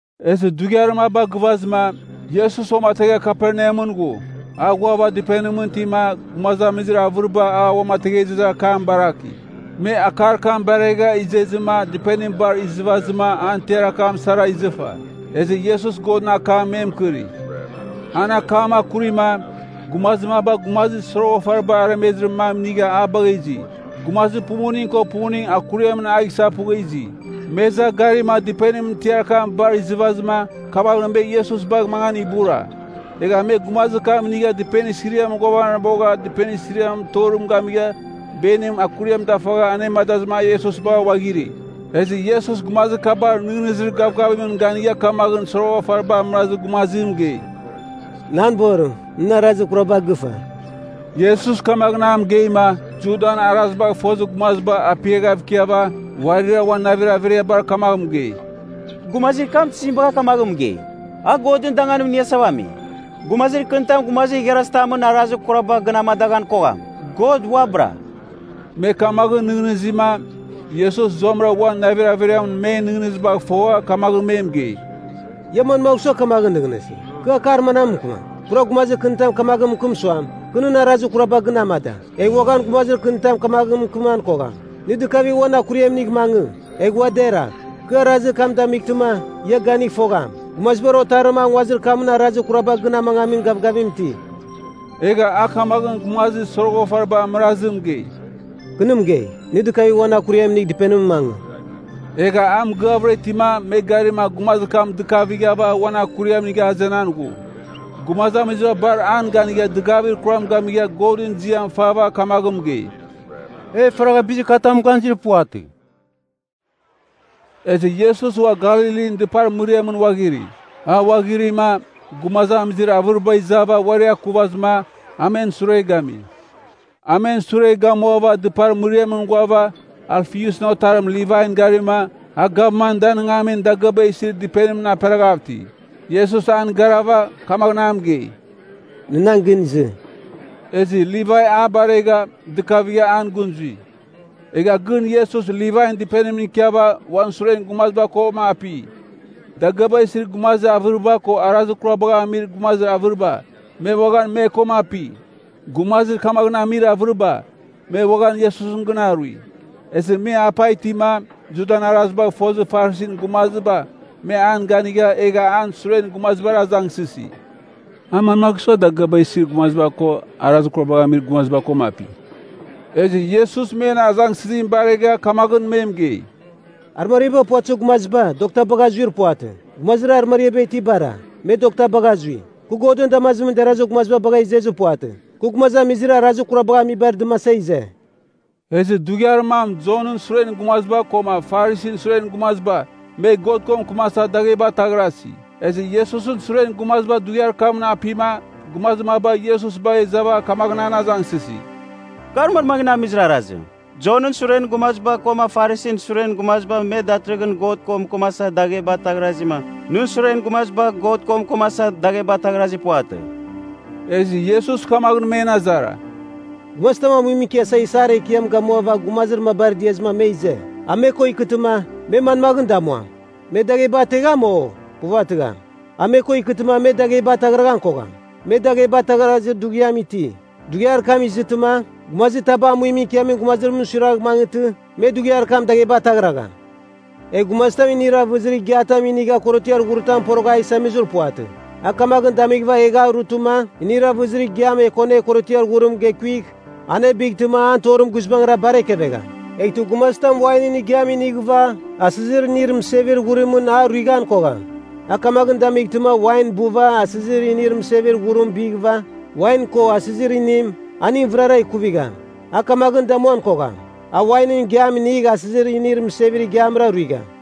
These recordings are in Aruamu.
Ezɨ dughiar maba gɨvazɨma, Iesus uamategha Kaperneamɨn ghu. A ghuava dɨpenimɨn itima gumazamizir avɨriba a uamatengezir akam baraki. Me akar kam baregha izezɨma dɨpenim bar izɨvazɨma an tiar akam sara izɨfa. Ezɨ Iesus Godɨn akam me mɨkɨri. An akam akurima, gumazir maba gumazir soroghafariba aremezir mam inigha a bagha izi. Gumazir pumuning ko pumuning akuriamɨn a gisaghpugha izi. Me iza garima dɨpenimɨn tiar akam bar izɨvazɨma, kamaghɨn me Iesus bagh mangan ibura. Egha me gumazir kam inigha dɨpenir siriamɨn ghuavanabogha dɨpenir siriamɨn torim gamigha beniba akuriam dafegha anemadazɨma a Iesus bagha ghuaghiri. Ezɨ Iesus gumazir kabar nɨghnɨzir gavgavimɨn ganigha kamaghɨn soroghafariba amɨrazir gumazim mɨgei, “Nan borim, nɨn arazir kuraba gɨfa.” Iesus kamaghɨn a mɨgeima, Judan arazibagh fozir gumaziba apiaghav ikiava uarira uan navir averiabar kamagh mɨgei, “Gumazir kam tizim bagha kamaghɨn mɨgei? A Godɨn danganim iniasava ami! Gumazir kɨnitam gumazir igharazitamɨn arazir kuraba gɨn amadaghan kogham. God uabɨra.” Me kamaghɨn nɨghnɨzima, Iesus zuamɨra uan navir averiamɨn men nɨghnɨzibagh fogha kamaghɨn me mɨgei, “Ia manmagh sua kamaghɨn nɨghnɨsi? Kɨ akar manam mɨkɨmam? Pura gumazir kɨnitam kamaghɨn mɨkɨm suam, kɨ nɨn arazir kuraba gɨn amada. Egh uaghan gumazir kɨnitam kamaghɨn mɨkɨman kogham, nɨ dɨkavigh uan akuriam inigh mangɨ, egh ua deragh. Kɨ arazir kam damightɨma, ia ganigh fogham, Gumazibar Otarim a nguazir kamɨn arazir kuraba gɨn amangamin gavgavim iti.” Egha a kamaghɨn gumazir soroghafariba amɨrazim mɨgei, “Kɨ nɨ mɨgei, nɨ dɨkavigh uan akuriam inigh dɨpenimɨn mangɨ.” Egha a mɨgɨavɨra itima me garima gumazir kam dɨkavighava uan akuriam inigha azenan ghu. Gumazamiziba bar an ganigha dɨgavir kuram gamigha Godɨn ziam fava kamaghɨn mɨgei, “E faragha bizir katamɨn ganizir puvatɨ!” Ezɨ Iesus ua Galilin dɨpar mɨriamɨn ghuaghiri. A ghuaghirima, gumazamizir avɨriba izava uari akuvazɨma, a men sure gami. A men sure gamuava dɨpar mɨriamɨn ghuava Alfiusɨn otarim Livain garima, a gavman danɨngamin dagɨaba isir dɨpenimɨn aperaghav iti. Iesus an garava, kamaghɨn a mɨgei, “Nɨ nan gɨn izɨ.” Ezɨ Livai a baregha, dɨkavigha an gɨn zui. Egha gɨn Iesus Livain dɨpenimɨn ikiava uan suren gumaziba koma api. Dagɨaba isir gumazir avɨriba koma arazir kurabagh amir gumazir avɨriba, me uaghan me koma api. Gumazir kamaghɨn amir avɨriba, me uaghan Iesusɨn gɨn arui. Ezɨ me apa itima, Judan arazibagh fozir Farisin gumaziba me an ganigha, egha an suren gumazibar azangsɨsi, “A manmagh sua dagɨaba isir gumaziba ko arazir kurabagh amir gumaziba koma api?” Ezɨ Iesus men azangsɨzim baregha kamaghɨn me mɨgei, “Arɨmariaba puvatɨzir gumaziba, dokta bagha zuir puvatɨ. Gumazir arɨmariaba itibara, me dokta bagha zui. Kɨ Godɨn damazimɨn derazir gumaziba bagha izezir puvatɨ. Kɨ gumazamizir arazir kurabagh amibar dɨmasa ize!” Ezɨ dughiar mam Jonɨn suren gumaziba koma Farisin suren gumaziba me God ko mɨkɨmasa dagheba ataghrasi. Ezɨ Iesusɨn suren gumaziba dughiar kamɨn apima gumazir maba Iesus bagha izava kamaghɨn an azangsɨsi, “Kar manmaghɨn amizir arazim? Jonɨn suren gumaziba koma Farisin suren gumaziba me datɨrɨghɨn God ko mɨkɨmasa dagheba ataghrazima, nɨn suren gumaziba God ko mɨkɨmasa dagheba ataghrazir puvatɨ.” Ezɨ Iesus kamaghɨn men azara, “Gumazitam amuimɨn ikiasa isar ekiam gamuava gumazir mabar diazɨma me ize. A me ko ikɨtɨma, me manmaghɨn damuam, me dagheba ategham, o? puvatɨgham. A me ko ikɨtɨma me dagheba ataghraghan kogham. Me dagheba ataghrazir dughiam iti. Dughiar kam izɨtɨma, gumazitaba amuimɨn ikiamin gumazimɨn suiragh mangɨtɨ me dughiar kam dagheba ataghragham. “Egh gumazitam inir avɨzir igiatam inigha korotiar ghuritam porogha a isamizir puvatɨ. A kamaghɨn damighɨva egh a rutɨma inir avɨzir igiam ekonegh korotiar ghurim gekuigh, anebightɨma an torim guizbangɨra bar ekevegham. Eghtɨ gumazitam wainɨn igiam inighɨva, asɨzir inir mɨsevir ghurimɨn a ruighan kogham. A kamaghɨn damightɨma wain buva asɨzir inir mɨsevir ghurim bighɨva, wain ko asɨzir inim, aning vɨrara ikuvigham. A kamaghɨn damuan kogham. A wainɨn igiam inigh asɨzir inir mɨsevir igiamra ruigham.”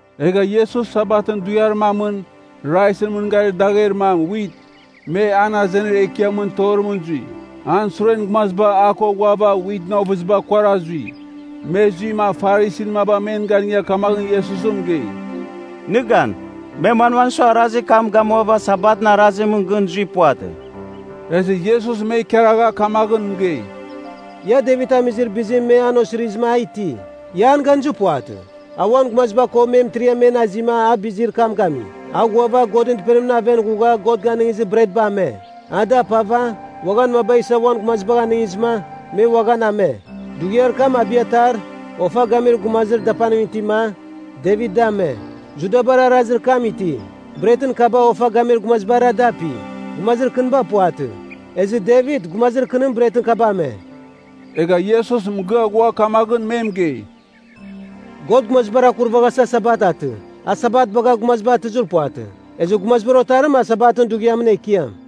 Egha Iesus Sabatɨn dughiar mamɨn, raizɨn mɨn garir dagher mam, wit, me an azenir ekiamɨn torimɨn zui. An suren gumaziba a ko ghuava witɨn ovɨziba kuara zui. Me zuima Farisin maba men ganigha kamaghɨn Iesus mɨgei, “Nɨ gan. Me manmagh sua arazir kam gamuava Sabatɨn arazimɨn gɨn zuir puvatɨ?” Ezɨ Iesus me ikaragha kamaghɨn mɨgei, “Ia, Devit amizir bizim me an osirizɨma a iti, ia an ganizir puvatɨ? A uan gumaziba ko me mɨtiriam men azima a bizir kam gami. A ghuava Godɨn Dɨpenimɨn aven ghugha God ganɨngizir bretba ame. A da apava, uaghan maba isa uan gumazibagh anɨngizɨma, me uaghan ame. Dughiar kam Abiatar, ofa gamir gumazibar dapanim itima, Devit dame. Judabar arazir kam iti. Bretɨn kaba ofa gamir gumazibara dapi, gumazir kɨniba puvatɨ. Ezɨ Devit, gumazir kɨnim, bretɨn kaba ame.” Egha Iesus mɨgɨa ghua kamaghɨn me mɨgei, “God gumazibar akurvaghasa Sabat atɨ. A Sabat bagha gumaziba atɨzir puvatɨ. Ezɨ Gumazibar Otarim a Sabatɨn dughiamɨn Ekiam.”